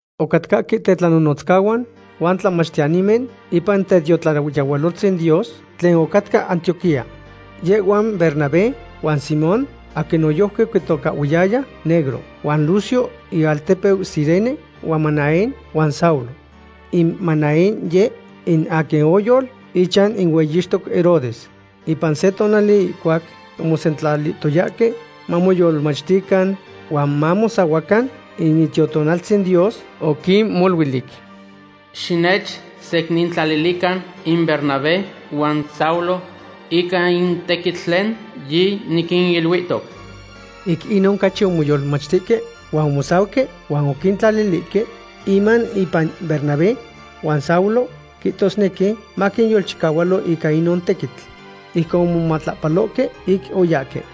Ocatcahque tetlanonotzcahuan huan tlamachtiyanimen ipan tetiotlayehualoltzin Dios tlen ocatca Antioquía. Yehhuan Bernabé, huan Simón aquin noyojqui oquitocahhuiyaya Negro, huan Lucio ialtepeu Cirene, huan Manaén, huan Saulo. In Manaén yeh in aquin oyol ichan in hueyixtoc Herodes. Ipan se tonali ihcuac omosentlalihtoyahque mamoyolmachtican huan mamosahuacan, in Itiotonaltzin Dios oquinmoluilic: ―Xinechsecnintlalilican in Bernabé huan Saulo ica in tequitl tlen yiniquiniluihtoc. Ic inon ocachi omoyolmachtihque huan omosauque huan oquintlalilihque inman impan Bernabé huan Saulo, quihtosnequi maquinyolchicahualo ica inon tequitl. Ijcon omomatlapalohque ic oyahque.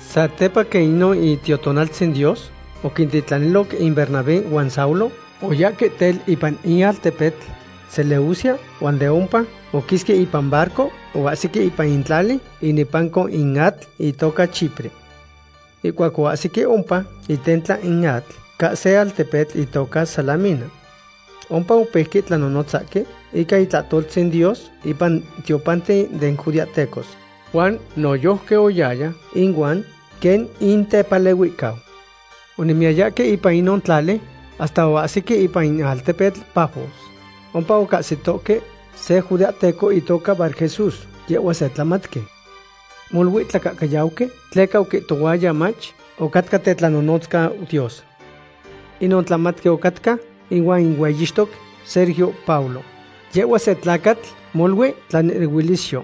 Satepa quen inon Itiotonaltzin Dios oquintitlaniloc in Bernabé huan Saulo, oyahque tel ipan in altepetl Seleucia huan de ompa oquisque ipan barco oahsique ipan in tlali inepanco in atl itoca Chipre. Ihcuac oahsique ompa itentla in atl ca se altepetl itoca Salamina. Ompa opeuque tlanonotzahque ica itlahtoltzin Dios ipan tiopanten den judeahtecos. Juan noyojqui oyaya inuan quen intepalehuihcau. Onemiyayahque ipan inon tlali hasta oahsique ipan in altepetl Pafos. Ompa ocahsitohque se judeahteco itoca Barjesús. Yehhua se tlamatqui. Molui tlacahcayauqui tleca oquihtohuaya mach ocatca tetlanonotzcau Dios. Inon tlamatqui ocatca ihuan in hueyixtoc Sergio Paulo. Yehhuatl se tlacatl molui tlanehnehuilisyo.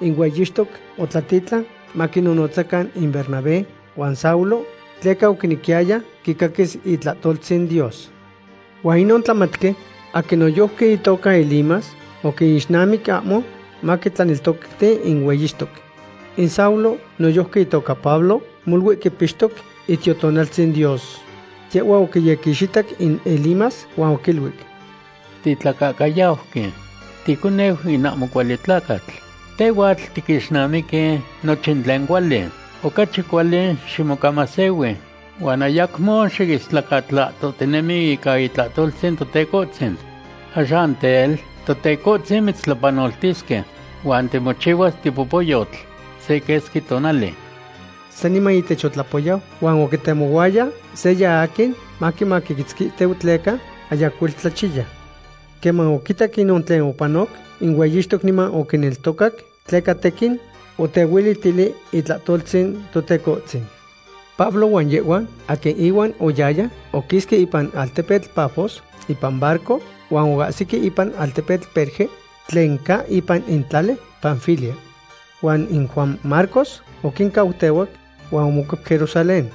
In hueyixtoc otlatitlan maquinnotzacan in Bernabé huan Saulo, tleca oquinequiyaya quicaquis itlahtoltzin Dios. Huan inon tlamatqui, aquin noyojqui itoca Elimas, oquinixnamic ahmo maquitlaneltocti in hueyixtoc. In Saulo, noyojqui itoca Pablo, molui quipixtoc Itiotonaltzin Dios. Yehhua oquiyequixitac in Elimas huan oquiluic: ―Titlacahcayauqui; ticoneu in ahmo cuali tlacatl. Tehhuatl tiquixnamiqui nochin tlen cuali. Ocachi cuali ximocamasehui huan ayacmo xiistlacatlahtohtinemi ica itlahtoltzin Totecohtzin. Axan tel, Totecohtzin mitztlapanoltisque, huan timochihuas tipopoyotl se quesqui tonali. Saniman ihtech otlapoyau, huan oquitemohuaya seya aquin maquimaquitzquitiu tleca ayacuel tlachiya. Queman oquitac inon tlen opanoc, in hueyixtoc niman oquineltocac tleca tequin otehuelitili itlahtoltzin Totecohtzin. Pablo huan yehhuan aquin ihuan oyahyaya oquisque ipan altepetl Pafos ipan barco, huan oahsihque ipan altepetl Perge tlen ca ipan in tlali Panfilia. Huan in Juan Marcos oquincautehuac huan omocuep Jerusalén.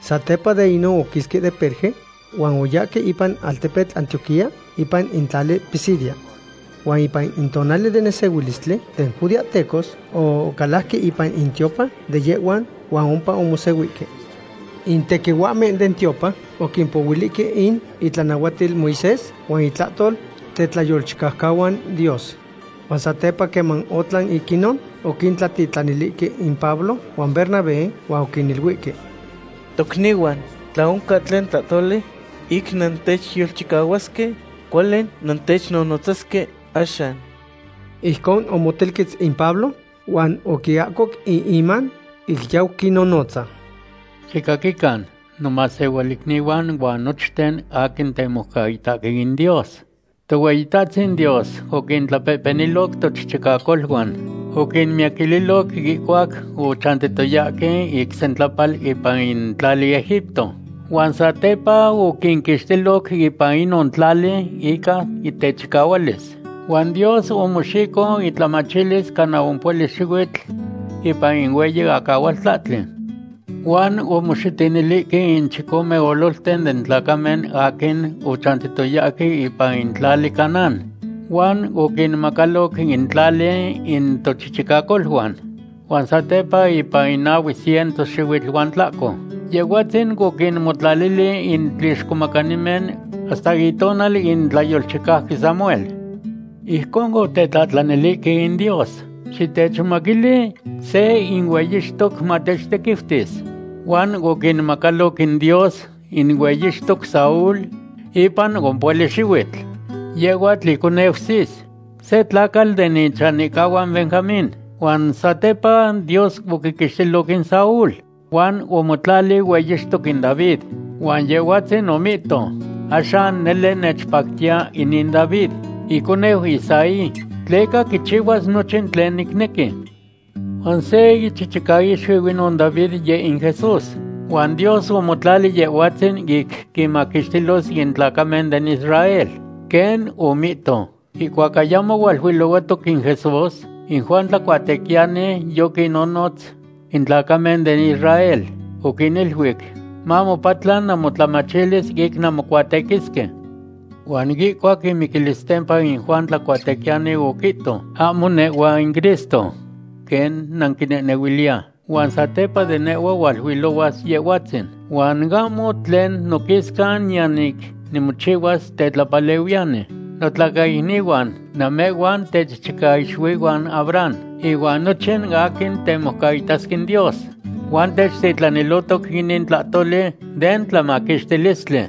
Satepa de inon oquisque de Perge huan oyahque ipan in altepetl Antioquía ipan in tlali Pisidia. Huan ipan in tonali den nesehuilistli den judeahtecos ocalajque ipan in tiopan de yehhuan huan ompa omosehuihque. In tequihuahmen den tiopan oquimpohuilihque in itlanahuatil Moisés huan intlahtol tetlayolchicaucahuan Dios. Huan satepa queman otlan ic inon, oquintlatitlanilihque in Pablo huan Bernabé huan oquiniluihque: ―Tocnihuan, tla oncan tlen tlahtoli ic nantechyolchicahuasque, cuali nantechnonotzasque axan. Ijcon omotelquetz in Pablo huan oquiahcoc in iman ic yau quinnonotza: ―Xicaquican, nomasehualicnihuan, ihuan nochten aquin temoucaitahque in Dios. Tohueyitahtzin Dios oquintlapehpeniloc tochichicacoluan. Oquinmiyaquililoc ihcuac ochantihtoyahque ic sentlapal ipan in tlali Egipto. Huan satepa oquinquixtiloc ipan inon tlali ica techicahualis. Huan Dios omoxico intlamachilis cana ompohuali xihuitl ipan in hueyi acahualtlahtli. Huan omoxitinilihque in chicome ololten den tlacamen aquin ochantiyayahque ipan in tlali Canaán huan oquinmacaloc in tlali in tochichicacoluan. Huan satepa ipan nahue ciento xihuitl huan tlahco, Yehhuatzin oquinmotlalili in tlixcomacanimen hasta itonal in tlayolchicauqui Samuel. Ijconon otetlahtlanilihque in Dios: “Xitechmomaquili se in hueyixtoc matechtequiutis.” Huan oquinmacaloc in Dios in hueyixtoc Saúl ipan ompohuali xihuitl. Yehhuatl iconeu Cis, se tlacatl den ichanihcahuan Benjamín. Huan satepa Dios oquiquixtilo in Saúl, huan omotlali hueyixtoc in David. Huan Yehhuatzin omihto: “Axan nele nechpactiya inin David, iconeu Isaí, tleca quichihuas nochin tlen nicnequi.” Huan se ichichicaixuiu inon David yeh in Jesús. Huan Dios omotlali Yehhuatzin ic quinmaquixtilos in tlacamen den Israel, quen omihto. Ihcuac ayamo hualuilohuahtoc in Jesús, in Juan Tlacuatequiyani yoquinnonotz in tlacamen den Israel. Oquiniluic: “Mamopatla namotlamachilis ic nanmocuatequisque.” Huan ihcuac imiquilistempa, in Juan Tlacuatequiyani oquihto: “Ahmo nehhua in Cristo quen nanquinehnehuiliya. Huan satepa de nehhua hualuilohuas Yehhuatzin huan ahmo tlen noquisca niyan ic nimochihua tetlapalehuiyani.” ’Notlacaicnihuan, namehhuan techichicaixuihuan Abraham, ihuan nochin aquin temoucaitasque in Dios. Huan techtitlanilihtoc inin tlahtoli den tlamaquixtilistli.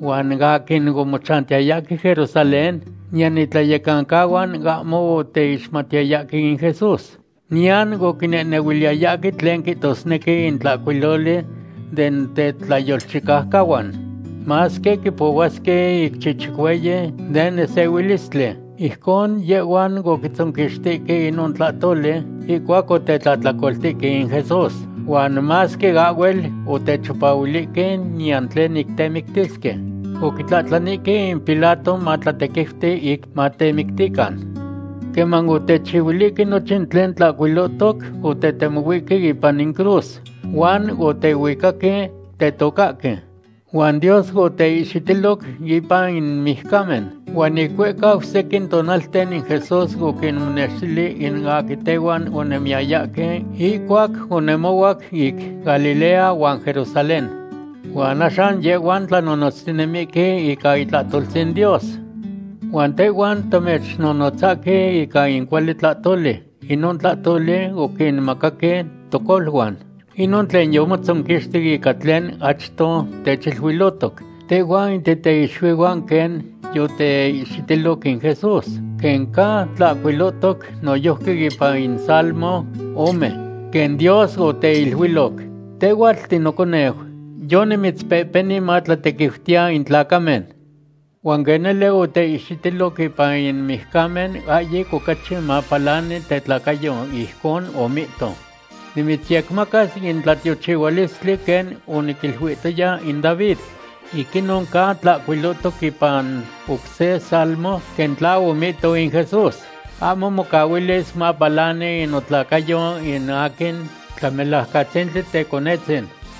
Huan in aquin omochantiyayahque Jerusalén niyan itlayecancahuan ahmo oteixmatiyayahque in Jesús. Niyan oquinehnehuiliyayahque tlen quihtosnequi in tlahcuiloli den tetlayolchicaucahuan, masque quipohuasque ic chichicueyi den nesehuilistli. Ijcon yehhuan oquitzonquixtique inon tlahcuiloli ihcuac otetlahtlacoltihque in Jesús. Huan masque ahhuel otechipahuilihque niyan tlen ic temictisque, oquitlahtlanihque in Pilato matlatequiuti ic matemictican. Queman otechihuilihque nochin tlen tlahcuilohtoc, otetemohuihque ipan in cruz huan otehuicaque tetocahque. Huan Dios oteihxitiloc ipan in mijcamen. Huan ic huehcau sequin tonalten in Jesús oquinmonextili in aquin tehuan onemiyayahque ihcuac onemohuac ic Galilea huan Jerusalén. Huan axan yehhuan tlanonotztinemihque ica itlahtoltzin Dios. ’Huan tehhuan tamechnonotzahque ica in cuali tlahtoli; inon tlahtoli oquinmacaque tocoluan. Inon tlen yomotzonquixti ica tlen achto techiluilohtoc tehhuan in titeixuihuan, quen yoteihxitiloc in Jesús. Quen ca tlahcuilohtoc noyojqui ipan in salmo ome, quen Dios oteiluiloc: “Tehhuatl tinoconeu; yonimitzpehpeni matlatequiutiya in tlacamen.” Huan quen nele oteihxitiloc ipan in mijcamen, ahyic ocachi mapalani tetlacayo, ijconon omihto: “Nimitzyecmacas in tlatiochihualistli quen oniquiluihtoya in David.” Ic inon ca tlahcuilotoc ipan oc se Salmo quen tla omihtoc in Jesús: “Ahmo mocahuilis mapalani in notlacayo in aquin Tlamelajcatzintli Teconetzin.”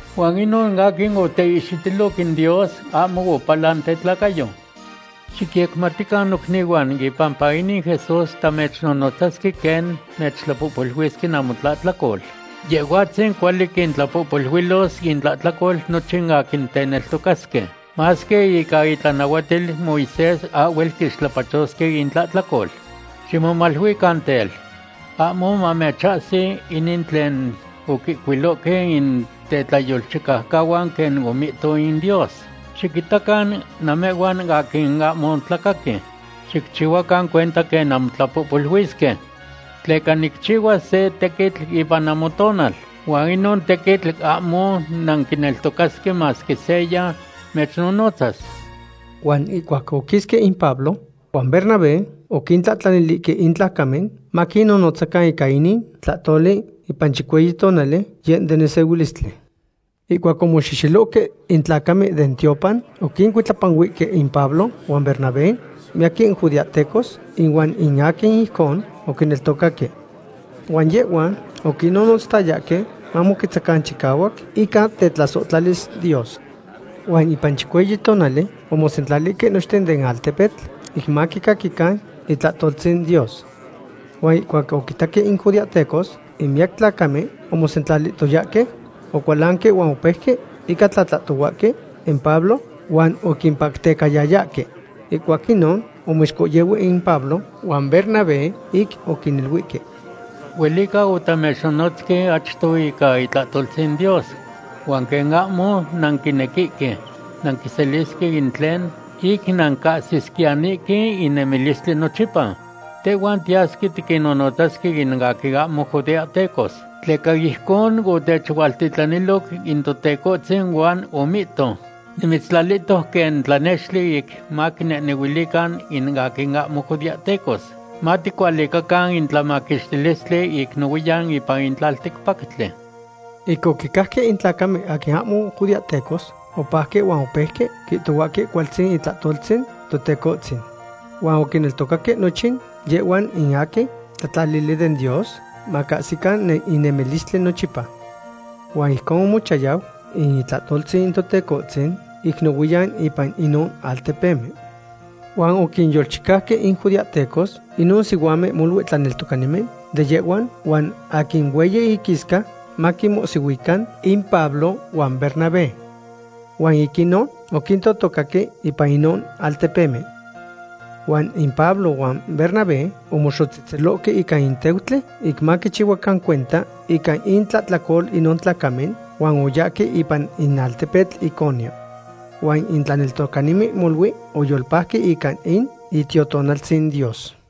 Huan inon aquin oteihxitiloc in Dios, ahmo opalan tetlacayo. Xicyecmatican nocnihuan, ipampa inin Jesús, tamechnonotzasque quen mechtlapohpoluisque namotlahtlacol. Yehhuatzin cuali quintlapohpoluilos intlahtlacol nochin in aquin teneltocasque, masque ica itlanahuatil Moisés ahhuel quixtlapachosque intlahtlacol. Ximomaluican tel, ahmo mamechahsi inin tlen oquihcuilohque in tetlayolchicaucahuan quen omihto in Dios: Xiquitacan namehhuan aquin ahmo tlacaqui; xicchihuacan cuenta quen nampolihuisque. Tleca nicchihuas se tequitl ipan namotonal, huan inon tequitl ahmo nanquineltocasque masque seya mechnonotzas. Huan ihcuac oquisque in Pablo huan Bernabé, oquintlahtlanilihque in tlacamen maquinnonotzacan ica inin tlahtoli ipan chicueyi tonali, yeh den nesehuilistli. Ihcuac yomoxexelohque in tlacamen den tiopan, oquincuitlapanuihque in Pablo huan Bernabé miyaquin judeahtecos ihuan in aquin ijcon oquineltocaque. Huan yehhuan oquinnonotzayayahque mamoquetzacan chicahuac ica tetlasohtlalis Dios. Huan ipan chicueyi tonali omosentlalihque nochten den altepetl ic maquicaquican itlahtoltzin Dios. Huan ihcuac oquitaque in judeahtecos in miyac tlacamen omosentlalihtoyahque, ocualanque huan opeuque ica tlatlahtohuahque in Pablo huan oquipactecayayahque. Ihcuac inon omoixcohyehuihque in Pablo huan Bernabé ic oquiniluihque: ―Huelica otamechnonotzque achto ica itlahtoltzin Dios, huan quen ahmo nanquinequihque nanquiselisque in tlen ic nancahsisquiyanihque in nemilistli nochipa, tehhuan tiyasque tiquinnotzasque in aquin ahmo judeahtecos. Tleca ijcon otechualtitlaniloc in Totecohtzin huan omihto: Nimitztlalihtoc quen tlanextli ic maquinehnehuilican in aquin ahmo judeahtecos. Maticualicacan in tlamaquixtilistli ic nohuiyan ipan in tlalticpactli. Ic oquicajque in tlacamen aquin ahmo judeahtecos, opajque huan opeuque quihtohuahque cualtzin itlahtoltzin Totecohtzin. Huan oquineltocaque nochin yehhuan in aquin tlatlalili den Dios macahsican in nemilistli nochipa. Huan ijcon omochayau in itlahtoltzin Totecohtzin ic nohuiyan ipan inon altepemen. Huan oquinyolchicauque in judeahtecos inon sihuamen molui tlaneltocanimen de yehhuan huan aquin hueyi inquisca, maquinmohsihuican in Pablo huan Bernabé. Huan ic inon oquintotocaque ipan inon altepemen. Huan in Pablo huan Bernabé omoxotzehtzelohque ica in teutli ic maquichihuacan cuenta ica intlahtlacol inon tlacamen, huan oyahque ipan in altepetl Iconio. Huan in tlaneltocanimen molui oyolpajque ica in Itiotonaltzin Dios.